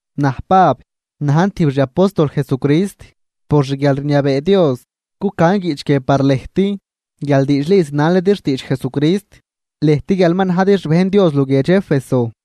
Naj Pab, najn tijb xi apóstol Jesucrist por xguialrniabee Dios. Cucan guiꞌch guie par lëjt guial diidxli zinalidi xtiidx Jesucrist, lëjt guial ma najdi xbejn Dios luguiedx Éfeso.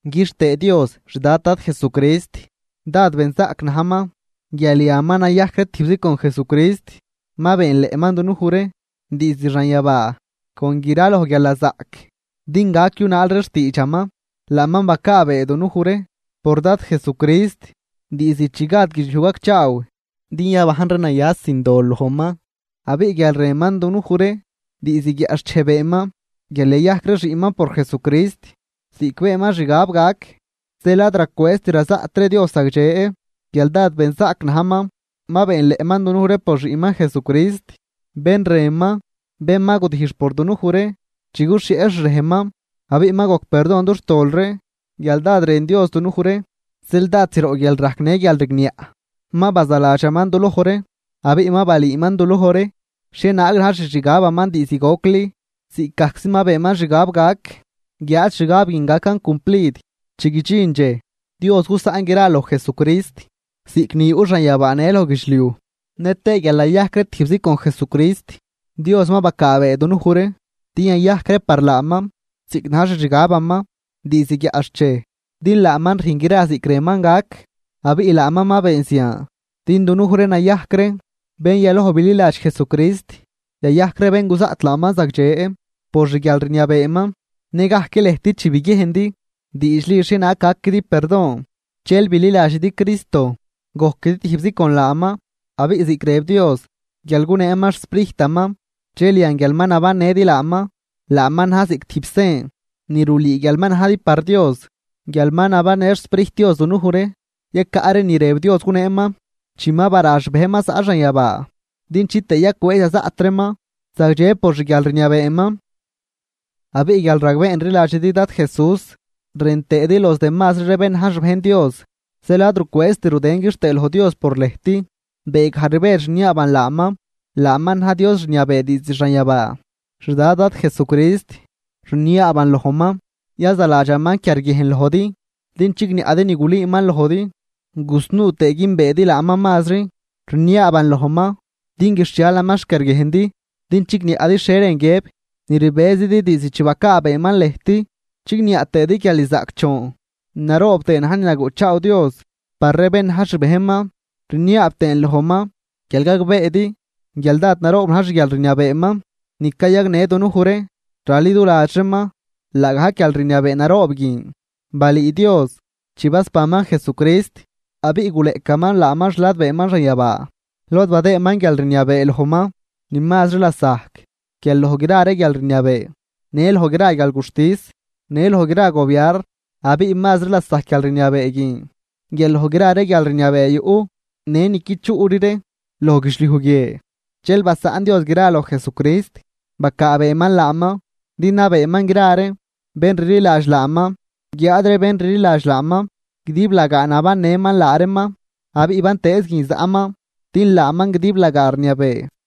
Quixtëë Dios, xdad Dad Jesucrist, dád benzaꞌc najman, guial yan ma nayajc ree tijbzi con Jesucrist, ma beenleꞌman dunuj ree diizd xanyabaa con graloj guialnazaꞌc din gac yunaal ree xtiidxaman. Laaman bacaabee dunuj ree por Dad Jesucrist diizd chi gad guidxliuj gacchaaw din yabajn ree naya sin dol lojman. Abiꞌ guial rënman dunuj ree, diizd guiaꞌxchej beenman guial yayajc ree xiꞌnman por Jesucrist ziꞌc beenman xgab gac. Zeel ad racwëëzt razaꞌt ree Dios zagdxe guial dád benzaꞌc najman, ma beenleꞌman dunuj ree por Xiꞌnman Jesucrist, bén rënman, bén ma gudijx por dunuj ree chi guxhieꞌ xrejnman, abiꞌ ma gojc perdon dux tol ree guial dád rën Dios dunuj ree. Zeel dád zroꞌ guialrajc në guialrigniaꞌ ma bazaladxaman duloj ree, abiꞌ ma balüüman duloj ree xhienaag na̱j xixgabaman diizd gocli, ziꞌcgajczi ma beenman xgab gac. Guiáad xgab guin gacan cumplid chi guidxin dxej, Dios gusaꞌn gra loj Jesucrist ziꞌc ni yuꞌ xanyabaa në loj guidxliuj. Nëtëë guial nayajc ree tijbzi con Jesucrist, Dios ma bacaabee dunuj ree din yayajc ree par laaman ziꞌc na̱j xixgabaman diizd guiaꞌxchej, din laaman rüjn gra ziꞌc rënman gac. Abiꞌ laaman ma been zian, din dunuj ree nayajc ree bén yaloj bililadx Jesucrist, yayajc ree bén guzaꞌt laaman zagdxe por xguialrniabeeman. Nëgajc lëjt chi biguiejndi diidxli xhienaag par gaquidi perdon dxel bililadxidi Cristo gojquidi tijbzi con laaman. Abiꞌ ziꞌc rëb Dios guial guneeman xSprijtaman, dxel yan guial ma nabannëdi laaman, laaman na̱j ziꞌc tijb sen ni rulüü guial ma najdi par Dios. Guial ma nabannë xSprijt Dios dunuj ree, yacaꞌ ree ni rëb Dios guneeman chi ma bara xbejnman zaꞌ xanyabaa, din chitëë yacwëëz yazaꞌt reeman zagdxe por xguialrniabeeman. Abiꞌ guial ragbeen rliladxidi Dad Jesús rën tëëdi los demazri ree bén na̱j xbejn Dios, zeel ad rucwëëzt rudën quixtëë loj Dios por lëjt, beegaj rbedx rniaaban laaman. Laaman na̱j Dios rniabee diizd xanyabaa, xDad Dad Jesucrist. Rniaaban lojman yazaladxaman quiarguiejn lojdi din chigniaꞌdi ni gulüüman lojdi gusnuu tëë güünbeedi laaman mazri. Rniaaban lojman din guixhialaman xquiarguiejndi din chigniaꞌdi xhie rën guiëb ni rbëzidi diizd chi bacaabeeman lëjt, chigniaꞌ tëëdi guial ni zaꞌcdxoon naroob tëë na̱j ni naguꞌchaaw Dios par ree bén na̱j xbejnman. Rniaab tëën lojman guial gagbeedi guial dád naroob na̱j xguialrniabeeman ni cayagnë dunuj ree raliduladx reeman. Laagajc guialrniabee naroob guin balüü Dios chi basbanman Jesucrist abiꞌ guleꞌcaman laaman xladbeeman xanyabaa lod badëëman guialrniabee lojman ni mazri lasajc guial loj gra ree guialrniabee, në loj gra guialguxtis në loj gra gobiarn. Abiꞌ mazri lasajc guialrniabee guin guial loj gra ree guialrniabee yuꞌ, në ni qui chuꞌri ree loj guidxliuj guie. Dxel basaꞌn Dios gran loj Jesucrist, bacaabeeman laaman din nabeeman gra ree bén rliladx laaman. Guiáad ree bén rliladx laaman, guidiblagaa nabannëman laa reeman abiꞌ bantëëz guin zaꞌman din laaman guidiblagaa rniabee.